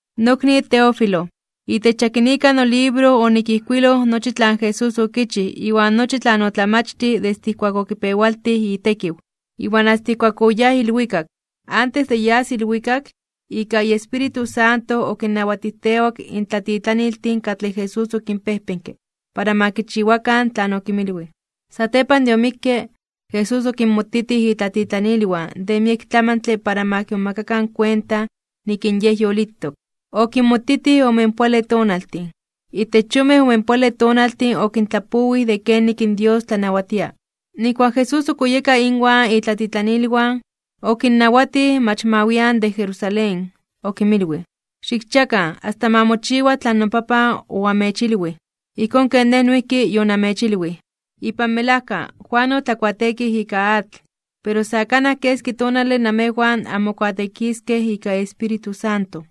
Nokni Teófilo: Itech yakinika nolibro onikijkuiloj nochi tlan Jesús okichij iwan nochi tlan otlamachtij desde ijkuak okipewaltij itekiw, iwan asta ijkuak oyáj ilwikak. Antes de yas ilwikak, ika iEspíritu Santo okinnawatijtewak in tlatitlaniltin katlej Jesús okinpejpenke para ma kichiwakan tlan okinmilwij. Satepan de omikke, Jesús okinmotitij itlatitlanilwan de miek tlamantle para ma kimomakakan kuenta nik in Yej yolitok. Okinmotitij omenpoale tonaltin. Itech yonmej omenpoale tonaltin okintlapowij de kenik in Dios tlanawatia. Nijkuak in Jesús ok oyeka inwan itlatitlanilwan, okinnawatij mach ma wian de Jerusalén. Okinmilwij: ―Xikchiakan asta ma mochiwa tlan noPapan oamechilwij, ijkón ken Nej noijki yonamechilwij. Ipan melajka, Juan otlakuateekij ika atl, pero sa kanaj keski tonale namejwan anmokuateekiskej ika Espíritu Santo.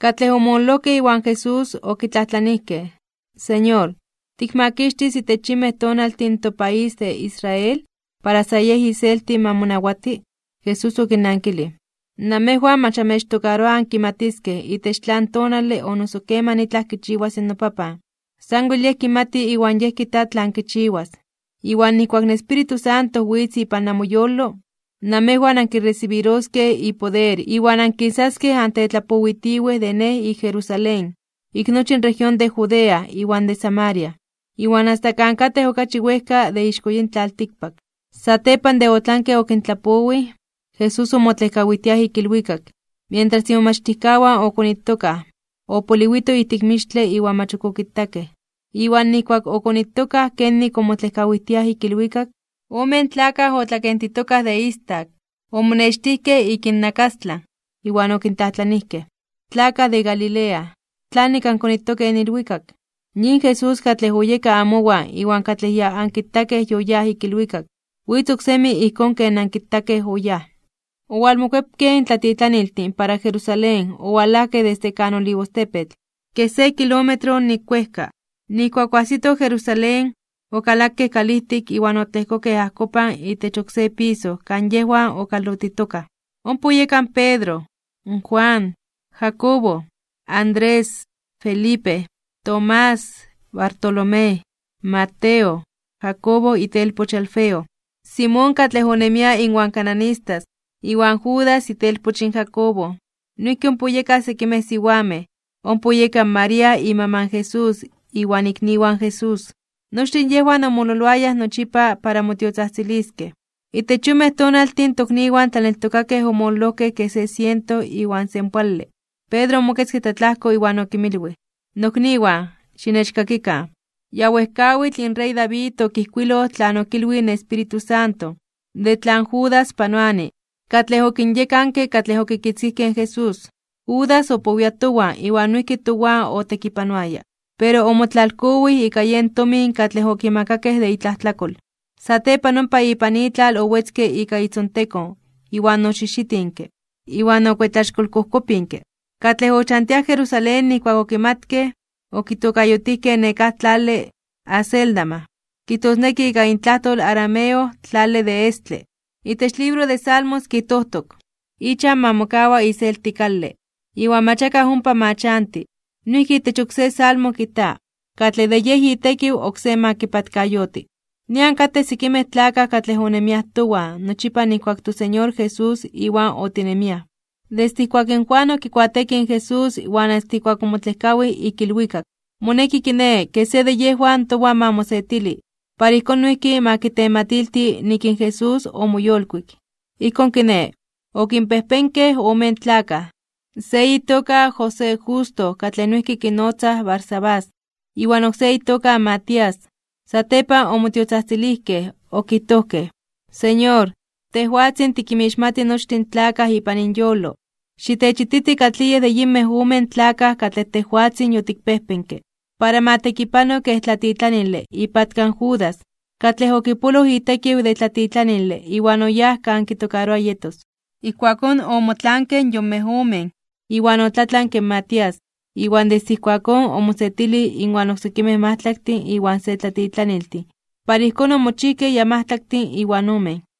Katlej omololojkej iwan Jesús, okitlajtlanijkej: ―Señor, ¿tikmakixtis itech yinmej tonaltin in topaís de Israel para sa yej iselti ma monawati? Jesús okinnankilij: ―Namejwan mach amechtokaroa ankimatiskej itech tlan tonale o noso keman itlaj kichiwas in noPapan. Sanwel Yej kimati iwan Yej kijta tlan kichiwas. Iwan nijkuak in Espíritu Santo witz ipan namoyolo, namejwan ankiresibiroskej ipoder iwan ankisaskej antetlapowitiwej de Nej ik Jerusalén, ik nochi in región de Judea iwan de Samaria, iwan asta kan katej okachi wejka de ixko yin tlaltikpak. Satepan de otlanke okintlapowij, Jesús omotlejkawijtiaj (otlejkotiaj) ik ilwikak, mientras imomachtijkawan okonitokaj, opoliwito ijtik mixtle iwan mach ok okitakej. Iwan nijkuak okonitokaj kenik omotlejkawijtiaj ik ilwikak, omen tlakaj otlakentitokaj de istak omonextijkej ik innakastlan, iwan okintlajtlanijkej: ―Tlakaj de Galilea, ¿tlanik ankonitokej in ilwikak? Yin Jesús katlej oyeka amowan iwan katlej ya ankitakej yoyáj ik ilwikak, witz oksemi ijkón ken ankitakej oyáj. Owalmokuepkej in tlatitlaniltin para Jerusalén owalajkej desde kan Olivostepetl, kej se kilómetro nik wejka. Nijkuak oajsitoj Jerusalén, okalakej kalijtik iwan otlejkokej ajkopan itech oksé piso kan yejwan okalotitokaj. Ompa oyeka in Pedro, Juan, Jacobo, Andrés, Felipe, Tomás, Bartolomé, Mateo, Jacobo itelpoch in Alfeo, Simón katlej onemia inwan cananistas, iwan Judas itelpoch in Jacobo. Noijki ompa oyekaj sekimej siwamej. Ompa oyeka in María imaman in Jesús iwan ikniwan in Jesús. Nochtin yejwan omololoayaj nochipa para motiotzajtziliskej. Itech yonmej tonaltin in tokniwan tlaneltokakej omololojkej kej se siento iwan senpoale, Pedro omoketzke tlatlajko iwan okinmilwij: ―Nokniwan, xinechkakikan. Ya wejkawitl in rey David okijkuiloj tlan okilwij in Espíritu Santo, de tlan Judas panoani, katlej okinyekanke katlej okitzkijkej in Jesús. Judas opowia towan iwan noijki towan otekipanoaya. Pero omotlalkowij ika yen tomin katlej okimakakej de itlajtlakol. Satepan ompa ipan itlal owetzke ika itzontekon iwan oxijxitinke, iwan okuetlaxkolkojkopinke. Katlej ochantiaj Jerusalén nijkuak okimatkej, okitokayotijkej nekáj tlale Acéldama, kijtosneki ika intlajtol arameo Tlale de Estle. Itech libro de Salmos kijtojtok: Ichan ma mokawa iselti kale, iwan mach akaj ompa ma chanti. Noijki itech oksé Salmo kijta: Katlej de yej itekiw oksé ma kipatkayoti. ’Nian katej sekimej tlakaj katlej onemiaj towan nochipa nijkuak in toSeñor Jesús Iwan otinemiaj, desde ijkuak in Juan okikuateekij in Jesús iwan asta ijkuak omotlejkawij (otlejkok) ik ilwikak. Moneki kiné, ke se de yejwan towan ma mosetili, para ijkón noijki ma kitematilti nik in Jesús omoyolkuik. Ijkón kiné, okinpejpenkej omen tlakaj: se itoka José Justo katlej noijki kinotzaj Barsabás, iwan oksé itoka Matías. Satepan omotiotzajtzilijkej okijtojkej: ―Señor, tejwatzin tikinmixmati nochtin tlakaj ipan inyolo, xitechititi katlij yej de yinmej omen tlakaj katlej tejwatzin yotikpejpenke para ma tekipano kej tlatitlanile ipatka in Judas, katlej okipoloj itekiw de tlatitlanile iwan oyáj kan kitokaroa yetos. Ijkuakón omotlaankej in yonmej omen, iwan otlatlanke in Matías, iwan desde ijkuakón omosetilij inwan oksekimej majtlaktin iwan se tlatitlaniltin para ijkón omochijkej ya majtlaktin iwan omen.